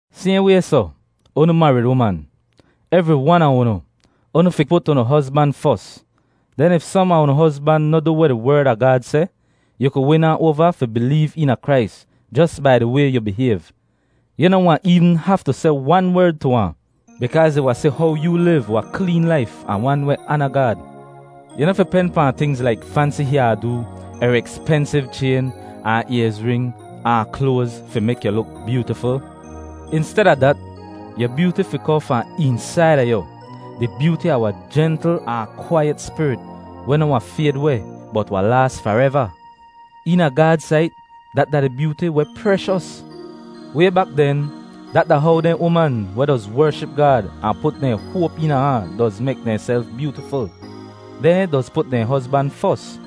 Sayhn way soh, unu marid uman, evri wan a unu, unu fi put unu hozban fos. Den if som a unu hozban noh du weh di Werd a Gaad seh, yu ku win ahn oava fi bileev eena Krais jos bai di way yu bihayv. Yu noh wahn eevn haftu seh wan werd tu ahn, bikaaz ih wahn si how yoo liv wahn kleen laif ahn wan weh aana Gaad. Yu noh fi pen pahn tingz laik fansi hyaa-doo er ekspensiv chayn ahn ayzring ahn kloaz fi mek yu luk byootiful. Insteda dat, yu byooti fi kohn fahn eensaida yu, di byooti a wahn jentl ahn kwaiyet spirit weh noh wahn fayd weh bot wahn laas fareva. Eena Gaad sait dat da di byooti weh preshos. Way bak den dat da how dehn uman weh doz wership Gaad ahn put dehn hoap eena ahn doz mek dehnself byootiful; dehn doz put dehn hozban fos.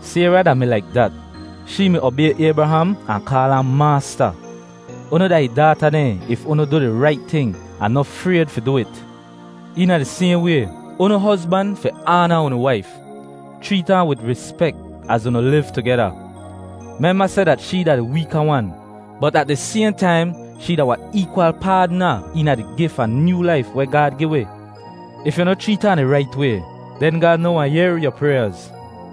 Sayra da-mi laik dat. Shee mi obay Aybraham ahn kaal ahn maasta. Unu da ih daata dehn if unu du di rait ting ahn noh frayd fi du it. Eena di sayhn way, unu hozban fi aana unu waif. Chreet ahn wid rispek az unu liv tugeda. Memba seh dat shee da di weeka wan, bot at di sayhn taim shee da wahn eekwal paadna eena di gif a nyoo laif weh Gaad gi wi. If yu noh chreet ahn di rait way, den Gaad noh wahn yehr yu pryaaz.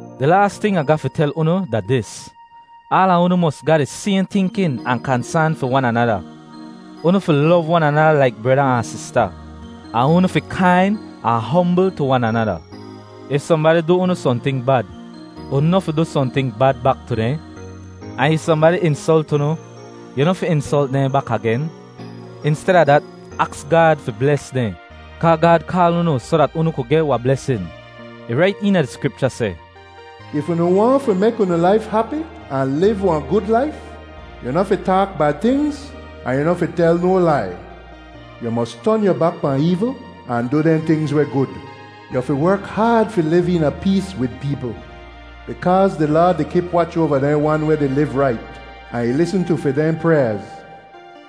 Di laas ting Ah ga fi tel unu da dis: Aala unu mos ga di sayhn tinkin ahn kansaan fi wan anada. Unu fi lov wan anada laik breda ahn sista, ahn unu fi kain ahn hombl tu wan anada. If sohnbadi du unu sohnting bad, unu noh fi du sohnting bad bak tu dehn. Ahn if sohnbadi insolt unu, yu noh fi insolt dehn bak agen. Insteda dat, aks Gaad fi bles dehn, kaa Gaad kaal unu soh dat unu kud geh wahn blesin. Ih rait eena di Skripcha seh, “If unu waahn fi mek unu laif hapi ahn liv wahn gud laif, yu noh fi taak bad tingz, ahn yu noh fi tel no lai. Yu mos ton yu bak pahn eevl ahn du dehn tingz weh gud. Yu fi werk haad fi liv eena pees wid peepl. Bikaaz di Laad di kip wach oava dehn wan weh di liv rait, ahn ih lisn tu fi dehn pryaaz.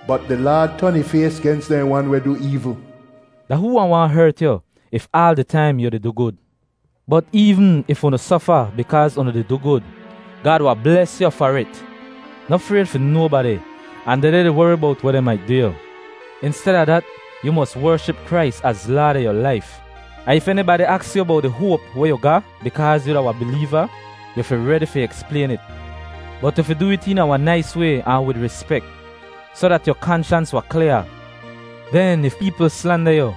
Bot di Laad ton ih fays gens dehn wan weh du eevl.” Da hoo wahn waahn hert yu if aal di taim yu di du gud? Bot eevn if unu sofa bikaaz unu di du gud, Gaad wahn bles yu far it. “Noh frayd fi nobadi, ahn dehdeh di wori bowt weh dehn mait du yu.” Insteda dat, yu mos wership Krais az Laad a yu laif. Ahn if enibadi aks yu bowt di hoap weh yu ga bikaaz yu da wahn bileeva, yu fi redi fi eksplayn it. Bot yu fi du it eena wahn nais way ahn wid rispek, soh dat yu kanshans wahn klyaa. Den if peepl slanda yu,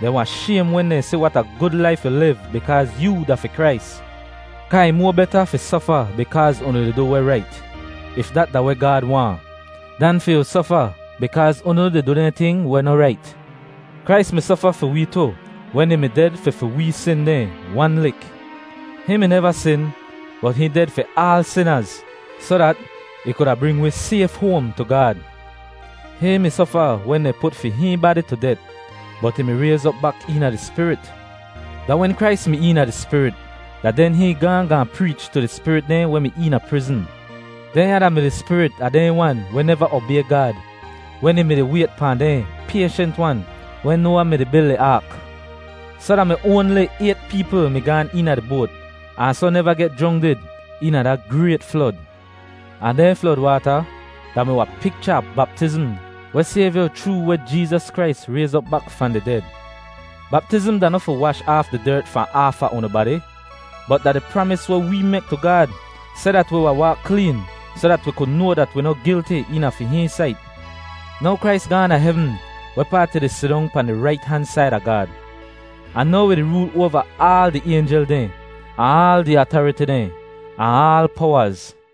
dehn wahn shaym wen dehn si wat a gud laif yu liv bikaaz yoo da fi Krais. Kaa ih moa beta fi sofa bikaaz unu di du weh rait, if dat da weh Gaad waahn, dan fi yu sofa bikaaz unu di du dehn ting weh noh rait. Krais mi sofa fi wee tu wen ih mi ded fi fi wee sin dehn wan lik. Hihn mi neva sin bot hihn ded fi aal sinaz soh dat ih kuda bring wi sayf hoam tu Gaad. Hihn mi sofa wen dehn put fi hihn badi tu det, bot ih mi rayz op bak eena di Spirit. Da wen Krais mi eena di Spirit da den hihn gaahn gaahn preech tu di spirit dehn weh mi eena prizn. Dehnya da-mi di spirit a dehn wan weh neva obay Gaad wen ih mi-di wayt pahn dehn payshent-wan wen Noawa mi-di bil ih aak. Soh da mi oanli ayt peepl mi gaan eena di boat ahn soh neva geh jrongdid eena da grayt flod. Ahn dehn flod waata da-mi wahn picha a baptizm weh sayv yu chroo weh Jeezas Krais rayz op bak fahn di ded. Baptizm da noh fi wash aaf di dert fahn aafa unu badi, bot da di pramis weh wee mek tu Gaad seh dat wi wahn waak kleen soh dat wi ku noa dat wi noh gilti eena fi hihn sait. Now Krais gaahn da hevn wehpaat ih di sidong pahn di rait han said a Gaad. Ahn now ih di rool oava aal di aynjel dehn, ahn aal di atariti dehn ahn aal powaz.